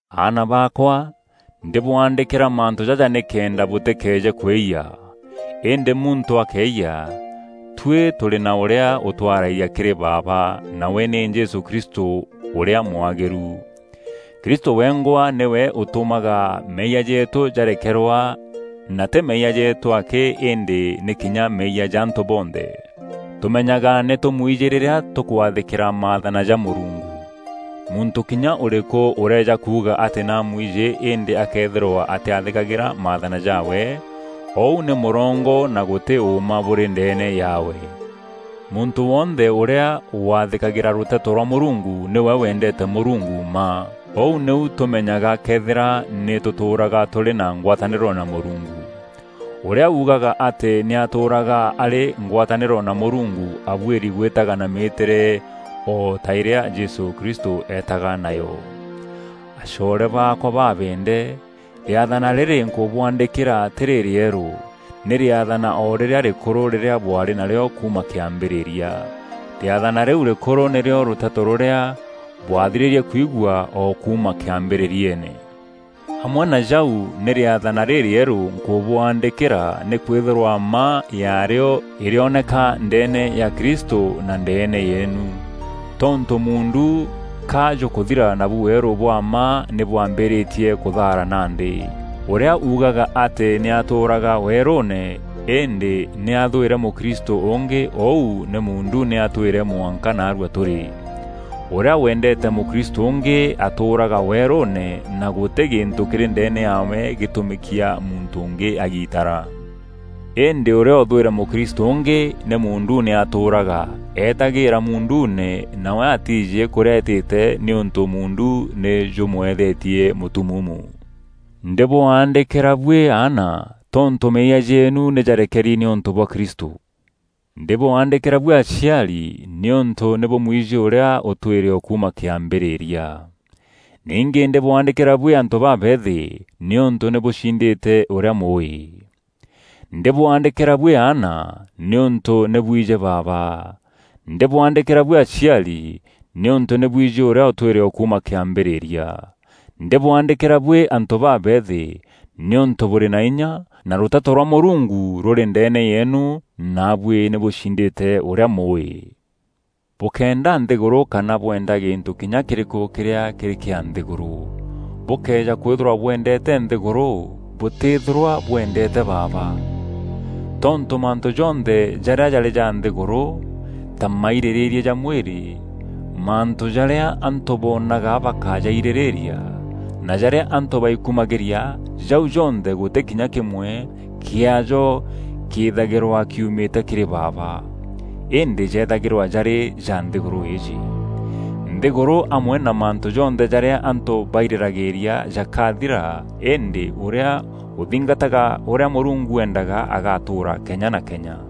Aana baakwa, ndîbwaandîkîra mantû jaja nîkenda bûtîkeeje kwîyia: îndî muntû akeeyia, tuî tûrî na ûrîa ûtwaraîria kîrî Baaba, nawe nî Jesû Kristû ûrîa mwagîru. Kristû wengwa nîwe ûtûmaga meeyia jeetû jarekerwa na tî meeyia jeetû akî îndî nî kinya meeyia ja antû bonthe. Tûmenyaga nî tûmwijî rîrîa tûkwathîkîra maathana ja Mûrungu. Muntû kinya ûrîkû ûrëeja kuuga atî nî amwijî îndî akëethîrwa atîathîkagîra maathana jaawe, ûu nî mûrongo na gûtî ûûma bûrî ndeene yaawe. Muntû wonthe ûrîa wathîkagîra Rûteto rwa Mûrungu nîwe wendeete Mûrungu mma. Ûu nîu tûmenyaga këethîra nî tûtûûraga tûrî na ngwatanîro na Mûrungu: ûrîa uugaga atî nî atûûraga arî ngwatanîro na Mûrungu abuîri gwîtaga na mîîtîre o ta îrîa Jesû Kristû eetaga nayo. Acoore baakwa babeende, rîathana rîrî nkûbwaandîkîra tî rîrîerû; nî rîathana o rîrîa rîrîkûrû rîrîa bwaarî narîo kuuma kîambîrîria. Rîathana rîu rîrîkûrû nîrîo rûteto rûrîa bwathirîrie kwigua o kuuma kîambîrîriene. Amwe na jau nî rîathana rîrîerû nkûbwaandîkîra nîkwîthîrwa mma yaarîo îrîoneka ndeene ya Kristû na ndeene yeenu. Tontû muundu ka jûkûthira nabu weerû bwa mma nî bwambîîrîtie kûthaara nandî. Ûrîa uugaga atî nî atûûraga weerûûne, îndî nî athwîre mûkristû ûngî ûu nî muunduune atwîre mwanka naarua tûrî. Ûrîa wendeete mûkristû ûngî atûûraga weerûûne, na gûtî gîntû kîrî ndeene yaawe gîtûmîkia muntû ûngî agitara. Îndî ûrîa ûthwîre mûkristû ûngî, nî muunduune atûûraga; eetagîîra muunduune nawe atiijî kûrîa eetîte, nîûntû muundu nî jûmûeethetie mûtumuumu. Ndîbwaandîkîra buî aana tontû meeyia jeenu nî jarekeri nîûntû bwa Kristû. Ndîbwaandîkîra buî aciari nîûntû nî bûmwijî ûrîa ûtwîre o kuuma kîambîrîria. Ningî ndîbwaandîkîra buî antû babeethî nîûntû nî bûcindîte ûrîa Mûûî. Ndîbwaandîkîra buî aana, nîûntû nî bwijî Baaba. Ndîbwaandîkîra buî aciari, nîûntû nî bwijî ûrîa ûtwîre o kuuma kîambîrîria. Ndîbwaandîkîra buî antû babeethi nîûntû bûrî na inya, na rûteto rwa Mûrungu rûrî ndeene yeenu naabuî nî bûcindîte ûrîa Mûûî. Bûkéenda nthîgûrû kana bweenda gîntû kinya kîrîkû kîrîa kîrî kîa nthîgûrû. Bûkëeja kwîthîrwa bwendeete nthîgûrû, bûtîthîrwa bwendeete Baaba. Tontû mantû jonthe jarîa jarî ja nthîgûrû, ta mairîrîîria ja mwîrî, mantû jarîa antû boonaga bakajairîrîîria na jarîa antû baikumagîria, jau jonthe gûtî kinya kîmwe kiaajo kîîthagîrwa kiumîte kîrî Baaba, îndî jethagîrwa jarî ja nthîgûrû îîjî. Nthîgûrû amwe na mantû jonthe jarîa antû bairîragîîria jakathira îndî ûrîa ûthingataga ûrîa Mûrungu eendaga agatûûra kenya na kenya.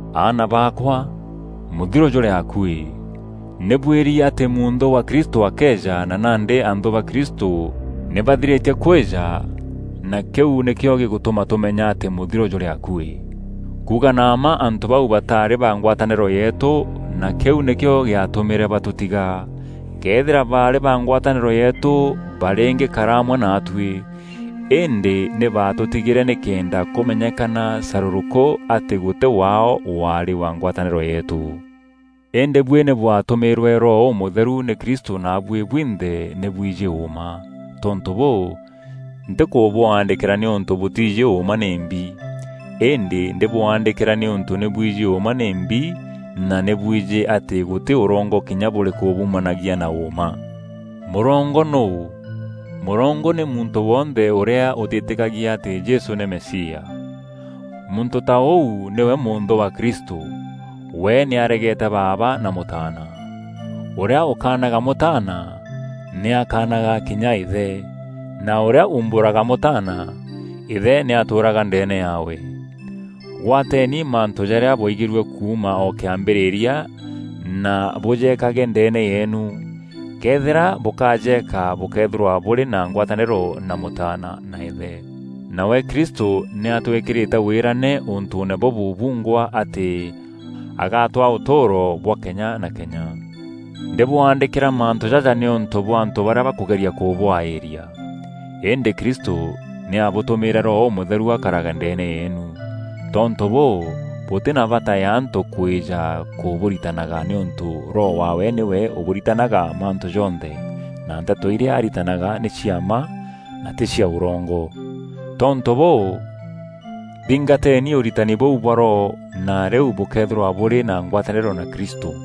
Aana baakwa, mûthiro jûrî akuî! Nî bwîîri atî mûnthû wa Kristû akeeja na nandî anthû ba Kristû nî bathirîtie kwîja na kîu nîkîo gîgûtûma tûmenya atî mûthiro jûrî akuî. Kuuga na mma antû bau bataarî ba ngwatanîro yeetû na kîu nîkîo gîatûmîre batûtiga. Këethîra baarî ba ngwatanîro yeetû barîngîkara amwe naatuî. Îndî nî baatûtigîre nîkenda kûmenyekana carûrûkû atî gûtî waao waarî wa ngwatanîro yeetû. Îndî buî nî bwatûmîîrwe Roho Ûmûtheru nî Kristû naabuî bwinthe nî bwijî ûûma. Tontû bûû, ntîbwaandîkîra nîûntû bûtiijî ûûma nîmbi; îndî ndîbwaandîkîra nîûntû nî bwijî ûûma nîmbi na nî bwijî atî gûtî ûrongo kinya bûrîkû bûumanagîa na ûûma. Mûrongo nûû? Mûrongo nî muntû wonthe ûrîa ûtîtîkagia atî Jesû nî Mesia. Muntû ta ûu nîwe mûnthû wa Kristû; we nî aregeete Baaba na Mûtaana. Ûrîa ûkaanaga Mûtaana nî akanaga kinya Îthe; na ûrîa umbûraga Mûtaana, Îthe nî atûûraga ndeene yaawe. Gwateni mantû jarîa bwaigîrue kuuma o kîambîrîria na bûjekage ndeene yeenu. Këethîra bûkajeka bûkeethîrwa bûrî na ngwatanîro na Mûtaana na Îthe. Nawe Kristû nî atwîkîrîte wîrane ûntûûne bûbû bungwa atî agatwaa ûtûûro bwa kenya na kenya. Ndîbwaandîkîra mantû jaja nîûntû bwa antû barîa bakûgeria kûbwaîria. Îndî Kristû nî abûtûmîrîte Roho Ûmûtheru akarage ndeene yeenu. Tontû bûû, bûtî na bata ya antû kwîja kûbûritanaga nîûntû Roho wawe nîwe ûkabûritanaga mantû jonthe, na nteto irîa aritanaga nî cia mma, na tî cia ûrongo. Tontû bûû, thingateni ûritani bûu bwa Roho na rîu bûkeethîrwa bûrî na ngwatanîro na Kristû.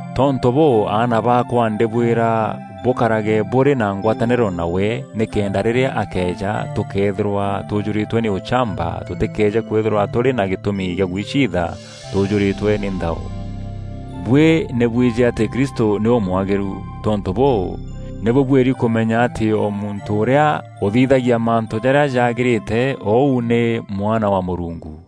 Tontû bûû aana baakwa ndîbwîra bûkarage bûrî na ngwatanîro nawe, nîkenda rîrîa akeeja tûkeethîrwa tûjûrîtwe nî ûchamba, tûtîkeeje kwîthîrwa tûrî na gîtûmi gîa gwiciitha tûjûrîtwe nî nthao. Buî nî bwijî atî Kristû nî ûmwagîru. Tontû bûû, nî bûbuîri kûmenya atî o muntû ûrîa ûthithagia mantû jarîa jagîrîte ûu nî mwana wa Mûrungu.